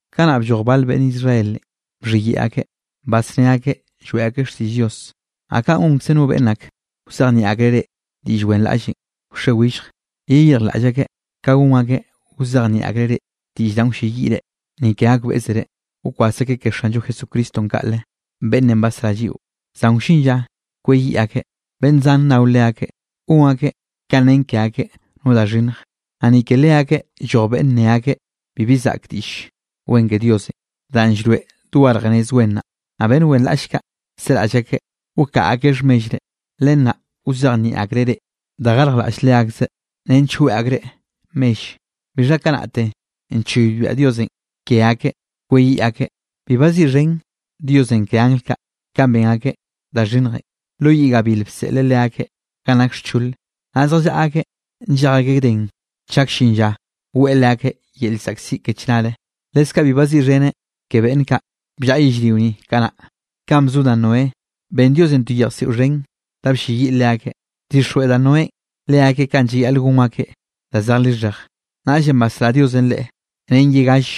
Kanaꞌ blloj bal beꞌnn Israelenꞌ bxhiyeꞌe akeꞌ, basné akeꞌ lloeꞌ akeꞌ xtiꞌll Dios, naꞌ kaꞌn gonkze no beꞌnn ak wzejnieꞌ akreꞌ reꞌ diꞌll wenraꞌllenꞌ wxe willje. Yeyirjlaꞌll akeꞌ ka gon akeꞌ wzejnieꞌ akreꞌ reꞌ diꞌll danꞌ wlleyiꞌ reꞌ, ni ke gakbeꞌzere. Wkwas akeꞌ ke Xanllo Jesucristonꞌ kaꞌle, beꞌnnenꞌ basrá lliꞌo, zan wllin lla kweyiꞌ akeꞌ. Beꞌnn zan nnao leakeꞌ, gon akeꞌ ka nen ke akeꞌ no da xhinnj. Naꞌ ni ke leakeꞌ lloj beꞌnne ne akeꞌ bibi zaꞌk Diꞌll Wen ke Diosenꞌ danꞌ llroeꞌ dogarj nez wen naꞌ. Naꞌ beꞌnn wenraꞌll kaꞌ seraꞌll akeꞌ wkaꞌa akeꞌ xhmellre. Len naꞌ wzejnieꞌ akreꞌ reꞌ da garjlaꞌll leakzeꞌ, nench weꞌe akreꞌ mell. Bixha kanaꞌte nchoybiaꞌ Diosenꞌ ke akeꞌ kweyiꞌ akeꞌ. Bi baziꞌxhen Diosenꞌ ke angl kaꞌ, kanꞌ ben akeꞌ da xhinnjenꞌ, lo yiꞌ gabil bseꞌleꞌ leakeꞌ ganꞌ nak xchole, naꞌ zjallaꞌa akeꞌ nllej akeꞌ gden chak llin lla weꞌe leakeꞌ yel llzaꞌkziꞌ ke chnare. Leskaꞌ bi baziꞌxheneꞌ ke beꞌnn kaꞌ bllaꞌa yellrio ni kanaꞌ, kanꞌ bzo da Noé. Ben Diosenꞌ to yejsiꞌo xhen da blleyiꞌ leakeꞌ. Bdixjweꞌ da Noénꞌ leakeꞌ kanꞌ llayaꞌl gon akeꞌ da zej lixhej. Naꞌllenꞌ basrá Diosenꞌ leꞌe ren ye gall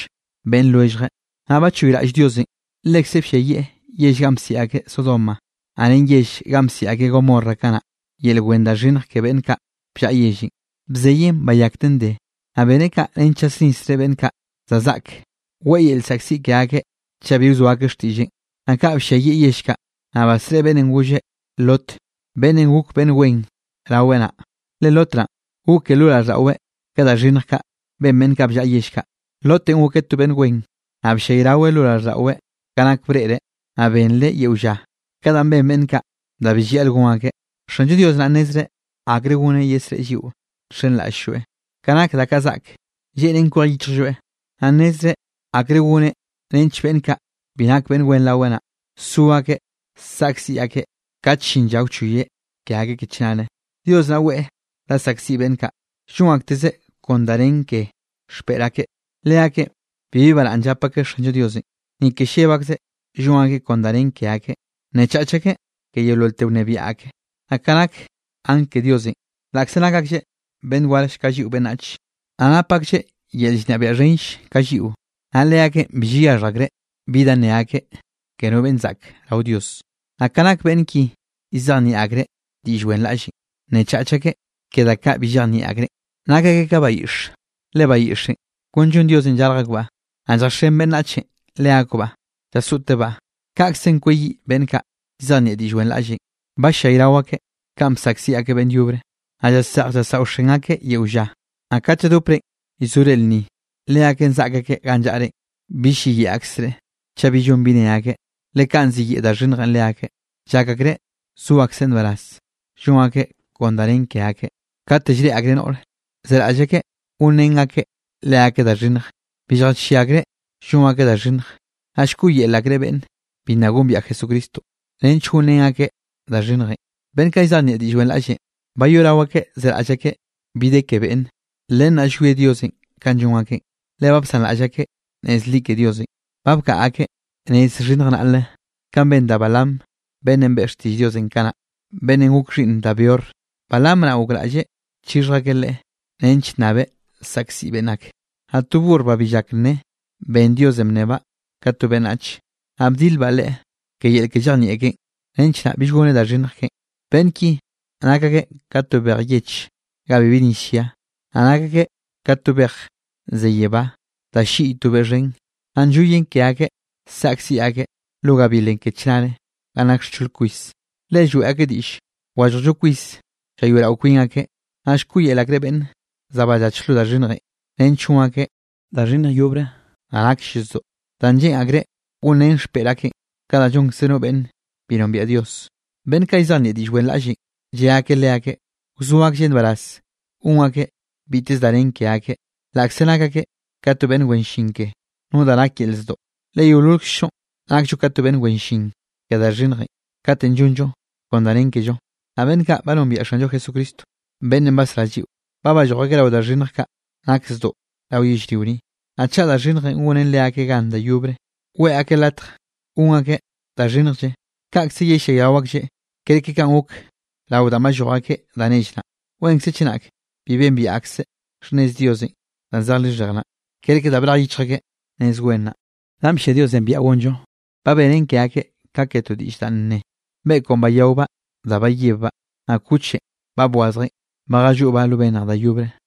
beꞌnn lwelljeꞌ. Naꞌ bachoyraꞌll Diosenꞌ, lekze blliayieꞌ yell ganꞌ bsiꞌi akeꞌ Sodoma, naꞌ ren yell ganꞌ bsiꞌi akeꞌ Gomorra kanaꞌ, yel wen da xhinnj ke beꞌnn kaꞌ bllaꞌa yellenꞌ. Bzeyeꞌn bayakten de. Naꞌ beneꞌ kaꞌ nench llasnisreꞌ beꞌnn kaꞌ za zaꞌk, weꞌe yel llzaꞌkziꞌ ke akeꞌ chaꞌ bi wzoa akeꞌ xtiꞌlleꞌn. Naꞌ ka blliayieꞌ yell kaꞌ, naꞌ basreꞌe beꞌnnenꞌ golle Lot beꞌnnenꞌ gok beꞌnn wen raweꞌ naꞌ, le Lot naꞌn goke lo raꞌlldaꞌweꞌ ka da xhinnj kaꞌ ben beꞌnn ka bllaꞌa yell kaꞌ. Lotenꞌ gokeꞌ to beꞌnn wen, naꞌ bllayraweꞌ lo raꞌlldaꞌweꞌ ka nak breꞌreꞌ, naꞌ benreꞌ yeo lla ka danꞌ ben beꞌnn kaꞌ da bi llayaꞌl gon akeꞌ. Xanllo Dios naꞌ nnezreꞌ akre goneꞌ yesreꞌe lliꞌo nxenraꞌll-lloeꞌ, ka nak da kaꞌ zaꞌk, lleꞌnen kwej yichjlloeꞌ, naꞌ nnezreꞌ akre goneꞌ nench beꞌnn kaꞌ bi nak beꞌnn wen raweꞌ naꞌ, so akeꞌ saꞌkziꞌ akeꞌ kat llin lla wchoyeꞌ ke akeꞌ ke chnare. Dios naꞌ weꞌe da saꞌkziꞌ beꞌnn kaꞌ llon aktezeꞌ kon da nen ke xpeꞌr akeꞌ. Leakeꞌn bibi baraꞌnn llap akeꞌ Xanllo Dios. Ni ke lleb akzeꞌ llon akeꞌ kon da nen ke akeꞌ, nnechach akeꞌ ke yeololte wnebiaꞌ ake. Naꞌ ka nak angl ke Diosenꞌ, laꞌkze nak aklleꞌ beꞌnn warll ka lliꞌo beꞌnnach, naꞌ nap akeꞌ yel llnebiaꞌ xhenll ka lliꞌo, naꞌ leakeꞌn bi llayaxhj akreꞌ bi da nne akeꞌ ke no beꞌnn zaꞌk rao Dios. Naꞌ ka nake beꞌnn ki llzejnieꞌ akreꞌ diꞌll wenraꞌllenꞌ, nnechach akeꞌ ke da kaꞌ bi llejnieꞌ akreꞌn. Nak akeꞌ ka bayiꞌxe, le bayiꞌxenꞌ kon llon Diosenꞌ llarj akbaꞌ, naꞌ lljaxen beꞌnnach leakbaꞌ llasoꞌtebaꞌ. Kaꞌkzenꞌ kweyiꞌ beꞌnn kaꞌ llzejnieꞌ diꞌll wenraꞌllenꞌ. Ba llayrao akeꞌ kanꞌ bsaꞌkziꞌ akeꞌ beꞌnn yobre. Naꞌ llaseꞌj llasaoxen akeꞌ yeo lla. Naꞌ kat lladoprenꞌ llzore lnni, leakeꞌn zaꞌk akeꞌ ganꞌ llaꞌrenꞌ, bill lliyeꞌe akzreꞌ chaꞌ bi llon bi ne akeꞌ, le kaꞌn ziyeꞌe da xhinnjenꞌ leakeꞌ. Llak akreꞌ zo akeꞌ nbaraz, llon akeꞌ kon da nen ke akeꞌ. Kate llreꞌe akreꞌ noꞌre, zeraꞌll akeꞌ gonrén akeꞌ leakeꞌ da xhinnj, bi lljachieꞌ akreꞌ llon akeꞌ da xhinnj. Naꞌ llkoꞌyel akreꞌ beꞌnne bi nna gombiaꞌ Jesucristo, nench gonrén akeꞌ da xhinnjenꞌ. Beꞌnn kaꞌ llzejnieꞌ diꞌll wenraꞌllenꞌ, bayoꞌrao akeꞌ zeraꞌll akeꞌ bi de ke beꞌnne. Len naꞌ llwie Dios kanꞌ llon akeꞌn. Le ba bsanraꞌll akeꞌ nez li ke Diosenꞌ. Ba bkaꞌa akeꞌ nez xhinnj naꞌle, kanꞌ ben da Balaam beꞌnnenꞌ beꞌe xtiꞌll Diosenꞌ kanaꞌ, beꞌnnenꞌ gok xhiꞌnn da Beor. Balaam naꞌ gokraꞌlleꞌ chixhj akeꞌ leꞌe, nench nnabeꞌ saꞌkziꞌ beꞌnn ak. Naꞌ to burr ba bi llak nne, ben Diosenꞌ bnnebaꞌ ka to beꞌnnach, naꞌ bdilbaꞌ leꞌe ke yel ke llejnieꞌ keꞌen, nench naꞌ bill goneꞌ da xhinnj keꞌen. Beꞌnn ki nak akeꞌ ka to bej yeche ga bibi nis llia, naꞌ nak akeꞌ ka to bej ze yebá da ll-lliꞌy to beꞌ xhen. Naꞌ nlloyen ke akeꞌ saꞌkziꞌ akeꞌ lo gabilenꞌ ke chnare ga nak xchol kwis. Le lloeꞌ akeꞌ diꞌll wallojllo kwis llayoeꞌrao kwin akeꞌ, naꞌ llkoꞌyel akreꞌ beꞌnn za ballach lo da xhinnjenꞌ, nench gon akeꞌ da xhinnj yobre da nakll zdoꞌ, da lleꞌn akreꞌ gonrén xpeꞌr akeꞌn, ka da llonkze no beꞌnne bi nombiaꞌ Dios. Beꞌnn kaꞌ llzejnieꞌ diꞌll wenraꞌllenꞌ lle akeꞌ leakeꞌ, wzo aklleꞌ nbaraz gon akeꞌ biteze da nen ke akeꞌ, laꞌkze nak akeꞌ ka to beꞌnn wen llin ke no da nak yel zdoꞌ. Le yeololkzllo nakllo ka to beꞌnn wen llin ke da xhinnjenꞌ kat llonllo kon da nen kello. Naꞌ beꞌnn kaꞌ ba nombiaꞌ Xanllo Jesucristo beꞌnnenꞌ basrá lliꞌo, ba balloj akeꞌ rao da xhinnj kaꞌ nak zdoꞌ rao yellrio ni, naꞌ chaꞌ da xhinnjenꞌ gonen leakeꞌ gan da yobre, weꞌe akeꞌ latj gon akeꞌ da xhinnjlle, kaꞌkze yellayrao aklleꞌ kerke kanꞌ gok rao danꞌ balloj akeꞌ da nell naꞌ. Wenre chenak bi bembiaꞌ akseꞌ xhnnez Diosenꞌ danꞌ zej lixhej naꞌ, kerke da brej yichj akeꞌ nez wen naꞌ, danꞌ bllia Diosenꞌ biaꞌa gonllo. Ba benen ke akeꞌ ka ke to diꞌll danꞌ ne: “Beꞌkwnꞌ bayaobaꞌ da bayebbaꞌ, naꞌ kuchenꞌ ba bwazjeꞌn, ba jalloꞌbaꞌ lo bennj da yobre.”